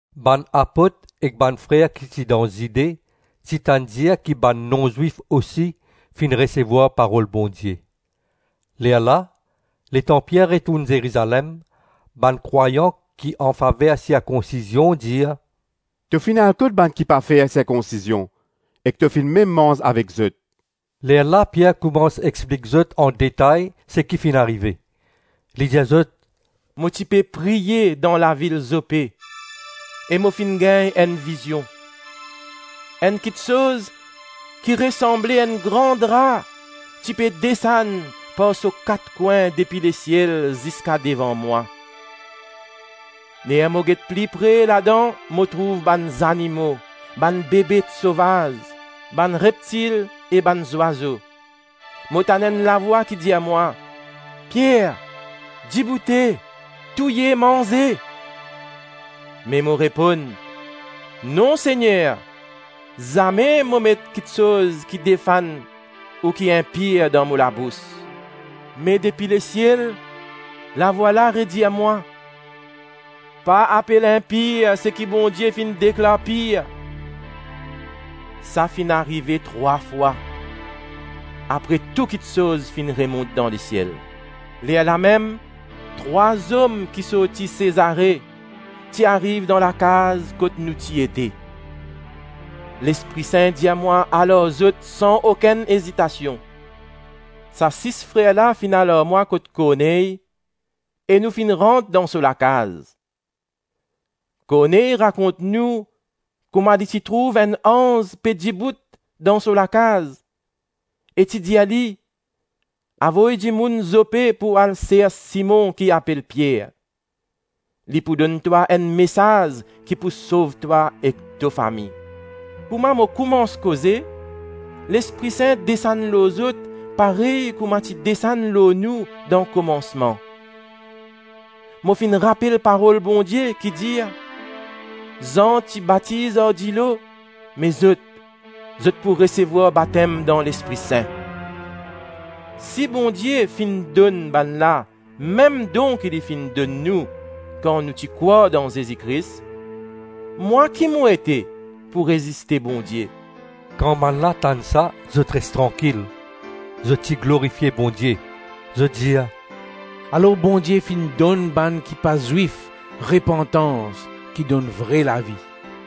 Bann apot ek bann frer ki ti dan Zide ti tann dir ki bann non-Zwif osi finn resevwar parol Bondie. Lerla, letan Pier retourn Zerizalem, bann krwayan ki anfaver sirkonsizion dir, “To finn al kot bann ki pa fer sirkonsizion ek to finn mem manz avek zot.” Lerla Pier koumans explik zot andetay seki finn arive. Li dir zot, “Mo ti pe priye dan lavil Zope e mo finn gagn enn vizion. Enn kiksoz ki resanble enn gran dra ti pe desann par so kat kwin depi lesiel ziska devan mwa. Ler mo get pli pre ladan mo trouv bann zanimo, bann bebet sovaz, bann reptil e bann zwazo. Mo tann enn lavwa ki dir mwa, ‘Pier, diboute; touye manze.’ Me mo reponn, ‘Non Segner, zame mo met kiksoz ki defann ou ki inpir dan mo labous.’ Me depi lesiel lavwa la redir mwa, ‘Pa apel inpir seki Bondie finn deklar pir.’ Sa finn arive trwa fwa, apre tou kiksoz finn remont dan lesiel. Lerlamem trwa zom ki sorti Sezare ti ariv dan lakaz kot nou ti ete. Lespri Sin dir mwa al ar zot san okenn ezitasion. Sa sis frer la finn al ar mwa kot Korney e nou finn rant dan so lakaz. Korney rakont nou kouma li ti trouv enn anz pe dibout dan so lakaz, e ti dir li, ‘Avoy dimoun Zope pou al sers Simon ki apel Pier. Li pou donn twa enn mesaz ki pou sov twa ek to fami.’ Kouma mo koumans koze, Lespri Sin desann lor zot parey kouma ti desann lor nou dan komansman. Mo finn rapel parol Bondie ki dir, ‘Zan ti batiz ar dilo, me zot, zot pou resevwar batem dan Lespri Sin.’ Si Bondie finn donn bannla mem don ki li finn donn nou kan nou ti krwar dan Zezi Kris, mwa ki mo ete pou reziste Bondie?” Kan bannla tann sa zot res trankil. Zot ti glorifie Bondie. Zot dir, “Alor Bondie finn donn bann ki pa Zwif repantans ki donn vre lavi.”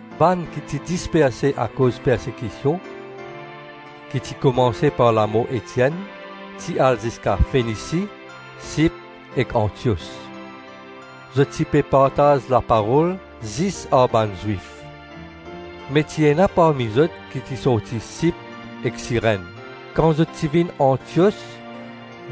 Bann ki ti disperse akoz persekision ki ti koumanse par lamor Etienn ti al ziska Fenisi, Sip ek Antios. Zot ti pe partaz laparol zis ar bann Zwif. Me ti ena parmi zot ki ti sorti Sip ek Sirenn. Kan zot ti vinn Antios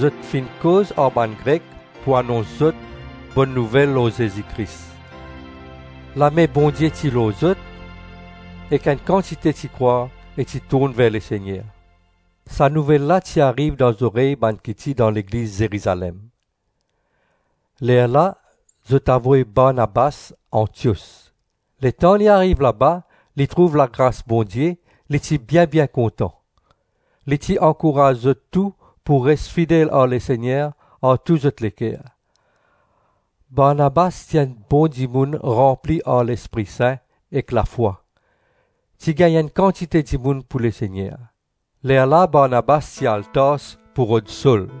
zot finn koz ar bann Grek pou anons zot Bonn Nouvel lor Zezi Kris. Lame Bondie ti lor zot ek enn kantite ti krwar e ti tourn ver Lesegner. Sa nouvel la ti ariv dan zorey bann ki ti dan Legliz Zerizalem. Lerla zot avoy Barnabas Antios. Letan li ariv laba li trouv lagras Bondie, li ti bien-bien kontan. Li ti ankouraz zot tou pou res fidel ar Lesegner ar tou zot leker. Barnabas ti enn bon dimoun ranpli ar Lespri Sin ek lafwa. Ti gagn enn kantite dimoun pou Lesegner. Lerla Barnabas ti al Tars pou rod Sol.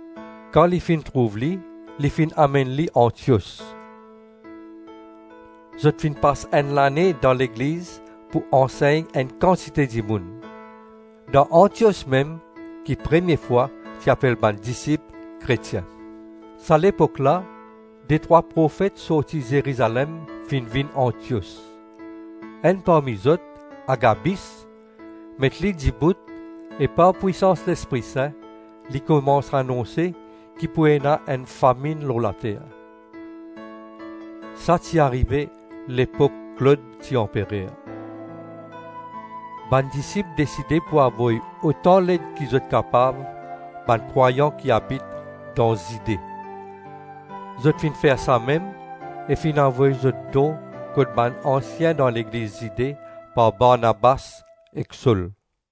Kan li finn trouv li, li finn amenn li Antios. Zot finn pas enn lane dan legliz pou ansegn enn kantite dimoun. Dan Antios mem ki premie fwa ti apel bann disip Kretien. Sa lepok la detrwa profet sorti Zerizalem finn vinn Antios. Enn parmi zot, Agabis, met li dibout e par pwisans Lespri Sin li koumans anonse ki pou ena enn faminn lor later. (Sa ti arive lepok Klod ti anperer.) Bann disip deside pou avoy otan led ki zot kapav bann krwayan ki abit dan Zide. Zot finn fer samem, e finn avoy zot don kot bann ansien dan legliz Zide par Barnabas ek Sol.